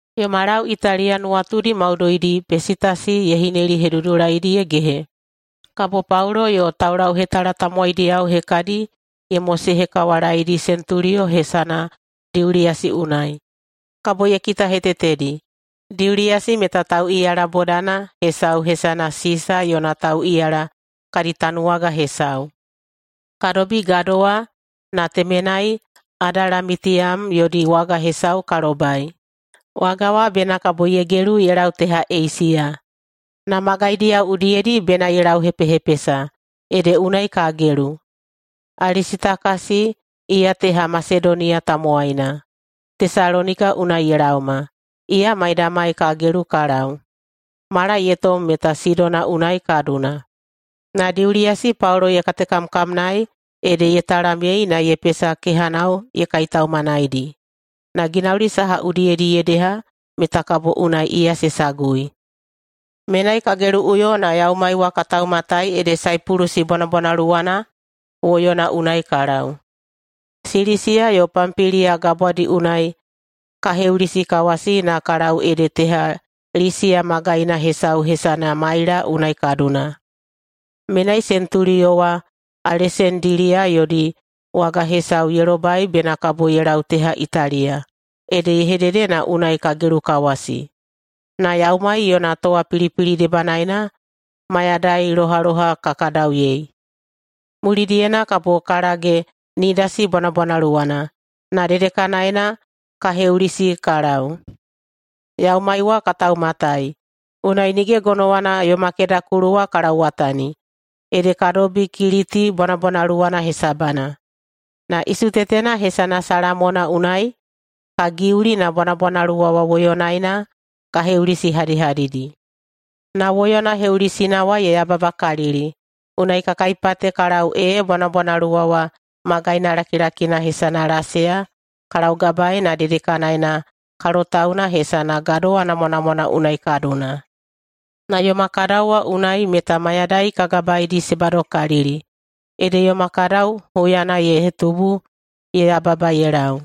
Yoma lau Italiya nuwatudi maudoidi Pesitasi ye hinelihedudulaidi ye gehe, kabo Paulo yo taulauhetala tamowaidiyao hekadi ye mosehekawalaedi sentuliyo hesana Diuliyasi unai, kabo ye kitahetetedi. Diuliyasi meta tauꞌiyala bodana hesau hesana “Sisa yona tauꞌiyala” kadi tanuwaga hesau. Ka dobi gadowa na temenai Adalamitiyam yodi waga hesau ka lobai. Waga wa bena kabo ye gelu ye lau teha Eisiya, na magaidiyao udiyedi bena ye lauhepehepesa, ede unai ka gelu. Alisitakasi, iya teha Masedoniya tamowaina, Tesalonika unai ye laoma, iya maidamai ka gelu ka lau. Mala ye tom meta Sidona unai ka duna, na Diuliyasi Paulo ye katekamkamnaei ede ye talamyei na ye pesa kehanao ye kaitaumanaidi, na ginauli saha udiyedi ye deha meta kabo unai iya se sagui. Menai ka geluꞌuyo na yaumai wa ka taumatai ede Saipulusi bwanabwanaluwana woyona unai ka lau. Silisiya yo Pampiliya gabwadi unai ka heulisikawasi na ka lau ede teha Lisiya magaina hesau hesana Maila unai ka duna. Menai sentuliyo wa Alesandiliya yodi waga hesau ye lobai bena kabo ye lau teha Italiya, ede ye hedede na unai ka gelukawasi. Na yaumai yona towapilipili debanaena mayadai lohaloha ka kadauyei. Mulidiyena kabo ka lage Nidasi bwanabwanaluwana, na dedekanaena ka heulisi ka lau. Yaumai wa ka taumatai, unai nige gonowana yoma kedakulu wa ka lauwatani, ede ka dobi Kiliti bwanabwanaluwana hesabana, na isutetena hesana Salamona unai ka giuli na bwanabwanaluwa wa woyonaena ka heulisihadihadidi. Na woyona heulisina wa ye yababakalili unai ka kaipate ka lau ee bwanabwanaluwa wa magaina lakilakina hesana Laseya ka laugabaei na dedekanaena kalotauna hesana Gadowa Namwanamwana unai ka duna. Na yoma kadau wa unai meta mayadai ka gabaedi se badokalili, ede yoma kadau huyana ye hetubu ye yababa ye lau.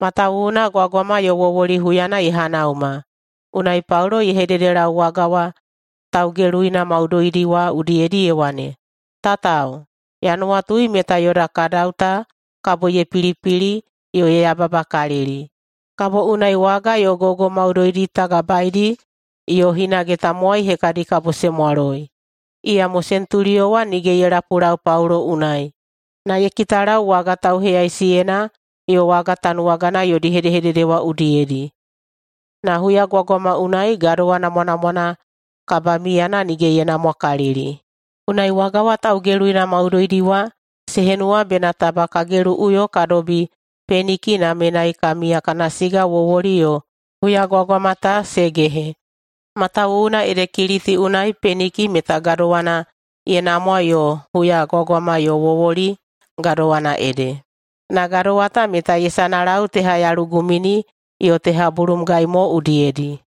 Matawuwuna gwagwama yo wowoli huyana ye hanauma. Unai Paulo ye hededelau waga wa taugeluina maudoidi wa udiyedi ye wane, “Tatao, ya nuwatui meta yoda kadau ta kabo ye pilipili yo ye yababakalili, kabo unai waga yo gogo maudoidi ta gabaedi yo hinage tamowai hekadi kabo se mwaloi.” Iyamo sentuliyo wa nige ye lapulau Paulo unai, na ye kitalau waga tauheyaisiyena yo waga tanuwagana yodi hedehedede wa udiyedi. Na huyagwagwama unai Gadowa Namwanamwana kabamiyana nige ye namwakalili. Unai waga wa taugeluina maudoidi wa se henuwa bena taba ka geluꞌuyo ka dobi Peniki na menai ka miya kana siga wowoli yo huyagwagwama ta se gehe. Matawuwuna ede Kiliti unai Peniki meta gadowana ye namwa yo huyagwagwama yo wowoli gadowana ede, na gadowa ta meta ye sanalau teha yalugumini yo teha bulumgai mo udiyedi.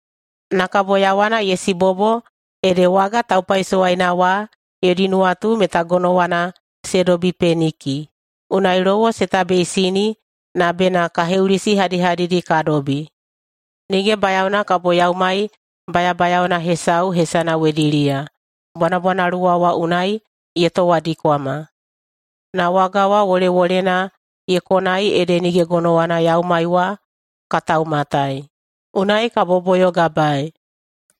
Na kabo yawana ye sibobo ede waga taupaisowaina wa yodi nuwatu meta gonowana se dobi Peniki. Unai lowo se tabeisini na bena ka heulisihadihadidi ka dobi. Nige bayaona kabo yaumai bayabayaona hesau hesana wediliya bwanabwanaluwa wa unai ye towadikwama. Na waga wa wolewolena ye konai ede nige gonowana yaumai wa ka taumatai, unai ka boboyogabaei.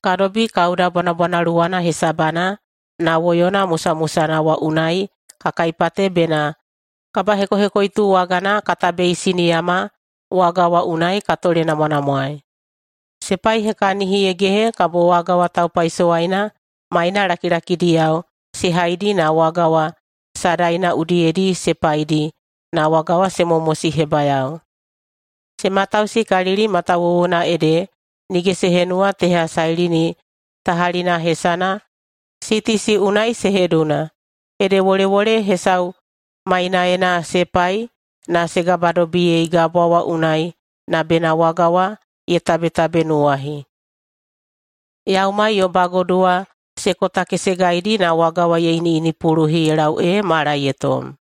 Ka dobi Kauda bwanabwanaluwana hesabana na woyona musamusana wa unai ka kaipate bena kabahekohekoitu wagana ka tabeisiniyama waga wa unai ka tolenamwanamwaei. Se paihekahini ye gehe kabo waga taupaisowaina maina lakilakidiyao se haidi na waga wa sadaina udiyedi se paidi na waga wa se momosihebayao. Se matausikalili matawuwuna ede nige se henuwa [teha Sailini tahalina hesana] Sitisi unai se heduna, ede wolewole hesau mainaena se pai na se gabadobiyei gabwa wa unai na bena waga wa ye tabetabenuwahi. Yaumai yo bagodu wa se kotakesegaidi na waga wa ye iniꞌinipuluhi ye lau ee mala ye tom,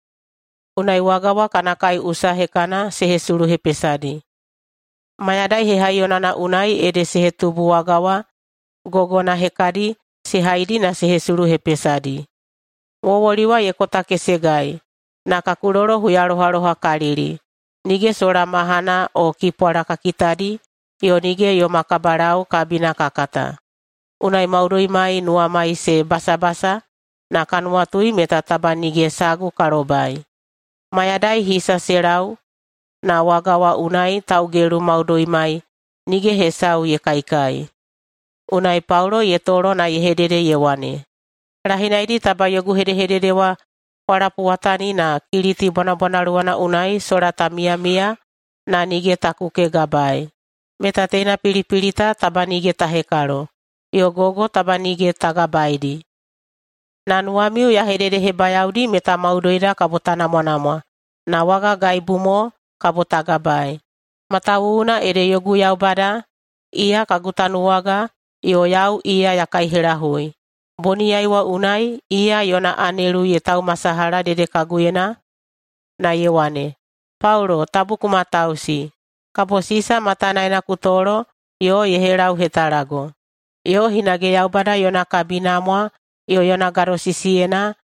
unai waga wa kana kaiꞌusa hekana se hesuluhepesadi. Mayadai hehaiyonana unai ede se hetubu waga wa gogona hekadi se haidi na se hesuluhepesadi. Wowoli wa ye kotakesegai na ka kulolo huyalohalohakalili nige sola mahana o kipwala ka kitadi yo nige yoma kabalau kabina ka kata, unai maudoimai nuwamai se basabasa na ka nuwatui meta taba nige sagu ka lobai. Mayadai hisa se lau na waga wa unai taugelu maudoimai nige hesau ye kaikai. Unai Paulo ye tolo na ye hedede ye wane, “Lahinaidi taba yogu hedehedede wa kwa lapuwatani na Kiliti bwanabwanaluwana unai sola ta miyamiya na nige ta kukegabaei, meta teina pilipili ta taba nige ta hekalo, yo gogo taba nige ta gabaedi. Na nuwamiu ya hededehebayaodi meta maudoida kabo ta namwanamwa na waga gaibu mo kabo ta gabaei. Matawuwuna ede yogu Yaubada, iya kagu tanuwaga yo yau iya ya kaihelahui, boniyai wa unai iya yona anelu ye taumasalaha dedekaguyena na ye wane, ‘Paulo, tabu ku matausi. Kabo Sisa matanaena ku tolo yo ye helauhetalago. Yo hinage Yaubada yona kabinamwa yo yona gadosisiyena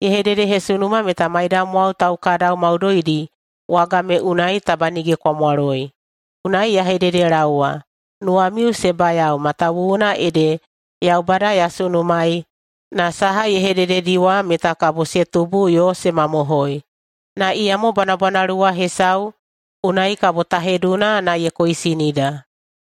ye hededehesunuma meta maidamwao taukadau maudoidi waga me unai taba nige kwa mwaloi.’ Unai ya hededelaowa, nuwamiu se bayao matawuwuna ede Yaubada ya sunumaei na saha ye hedededi wa meta kabo se tubu yo se mamohoi. Na iyamo bwanabwanaluwa hesau unai kabo ta heduna na ye koisinida.”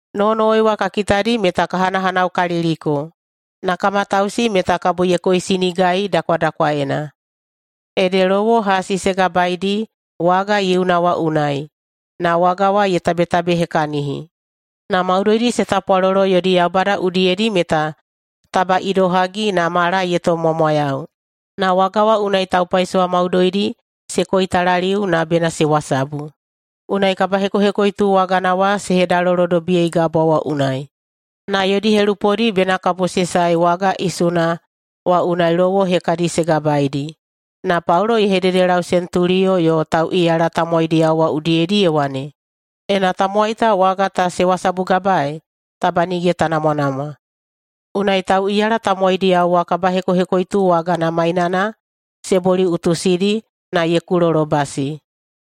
Nowonowoi wa ka kitadi meta ka hanahanaukaliliko, na ka matausi meta kabo ye koisinigai dakwadakwaena. Ede lowo hasi se gabaedi waga yiuna wa unai, na waga wa ye tabetabehekahini. Na maudoidi se tapwalolo yodi yaubada udiyedi meta taba idohagi na mala ye tomꞌmwamwayau. Na waga wa unai taupaisowa maudoidi se koitalaliu na bena se wasabu. Unai kabahekohekoitu wagana wa se hedalolodobiyei gabwa wa unai. Na yodi helupodi bena kabo se sae waga isuna wa unai lowo hekadi se gabaeidi. Na Paulo ye hededelau sentuliyo yo tauꞌiyala tamowaidiyao wa udiyedi ye wane, “Ena tamowai ta waga ta se wasabugabaei, taba nige ta namwanamwa.” Unai tauꞌiyala tamowaidiyao wa kabahekohekoitu wagana mainana se boliꞌutusidi na ye kulolobasi.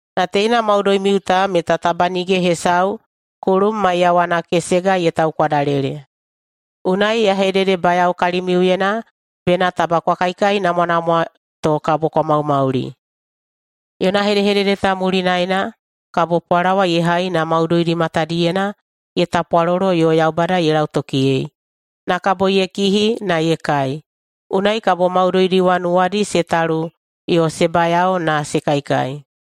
Na teina maudoimiu ta meta taba nige hesau kulum maiyawana kesega ye taukwadalele. Unai ya hededebayao kalimiuyena bena taba kwa kaikainamwanamwa to kabo kwa maumauli.” Yona hedehedede ta mulinaena kabo pwalawa ye hai na maudoidi matadiyena ye tapwalolo yo Yaubada ye lautokiyei, na kabo ye kihi na ye kai. Unai kabo maudoidi wa nuwadi se talu yo se bayao na se kaikai.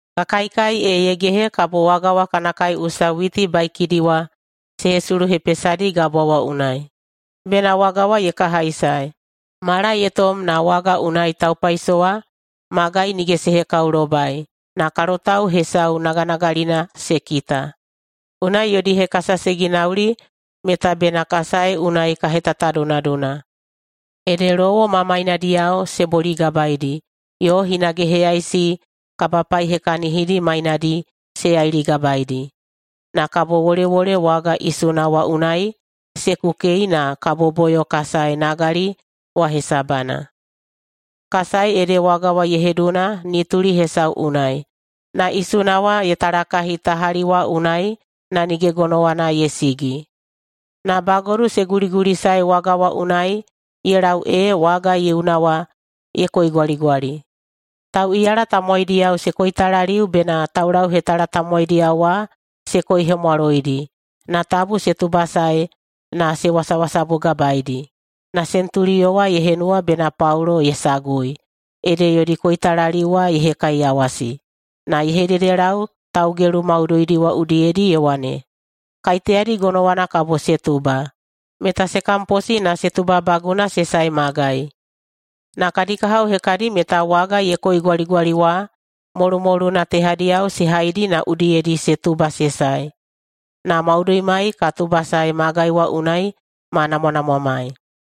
Ka kaikai ee ye gehe kabo waga wa kana usaꞌusa witi baikidi wa se hesuluhepesadi gabwa wa unai, bena waga wa ye kahaisae. Mala ye tom na waga unai taupaisowa magai nige se hekaolobai, na kalotau hesau naganagalina se kita. Unai yodi hekasa se ginauli meta bena ka sae unai ka hetatadunaduna. Ede lowo ma mainadiyao se boligabaeidi yo hinage heyaisi kabapaihekahinidi mainadi se yailigabaeidi. Na kabo wolewole waga isuna wa unai se kukei na ka boboyo ka sae nagali wa hesabana. Ka sae ede waga wa ye heduna nituli hesau unai, na isuna wa ye talakahi tahali wa unai na nige gonowana ye sigi, na bagodu se guligulisae waga wa unai ye lau ee waga yiuna wa ye koigwaligwali. Tauꞌiyala tamowaidiyao se koitalaliu bena taulauhetala tamowaidiyao wa se koihemwaloidi na tabu se tubasae na se wasawasabugabaeidi. Na sentuliyo wa ye henuwa bena Paulo ye sagui, ede yodi koitalaliu wa ye hekaiyawasi, na ye hededelau taugelu maudoidi wa udiyedi ye wane, “Kaiteyadi gonowana kabo se tuba, meta se kamposi na se tubabaguna se sae magai.” Na kadi kahao hekadi meta waga ye koigwaligwali wa molumoluna tehadiyao se haidi na udiyedi se tuba se sae. Na maudoimai ka tubasae magai wa unai ma namwanamwamai.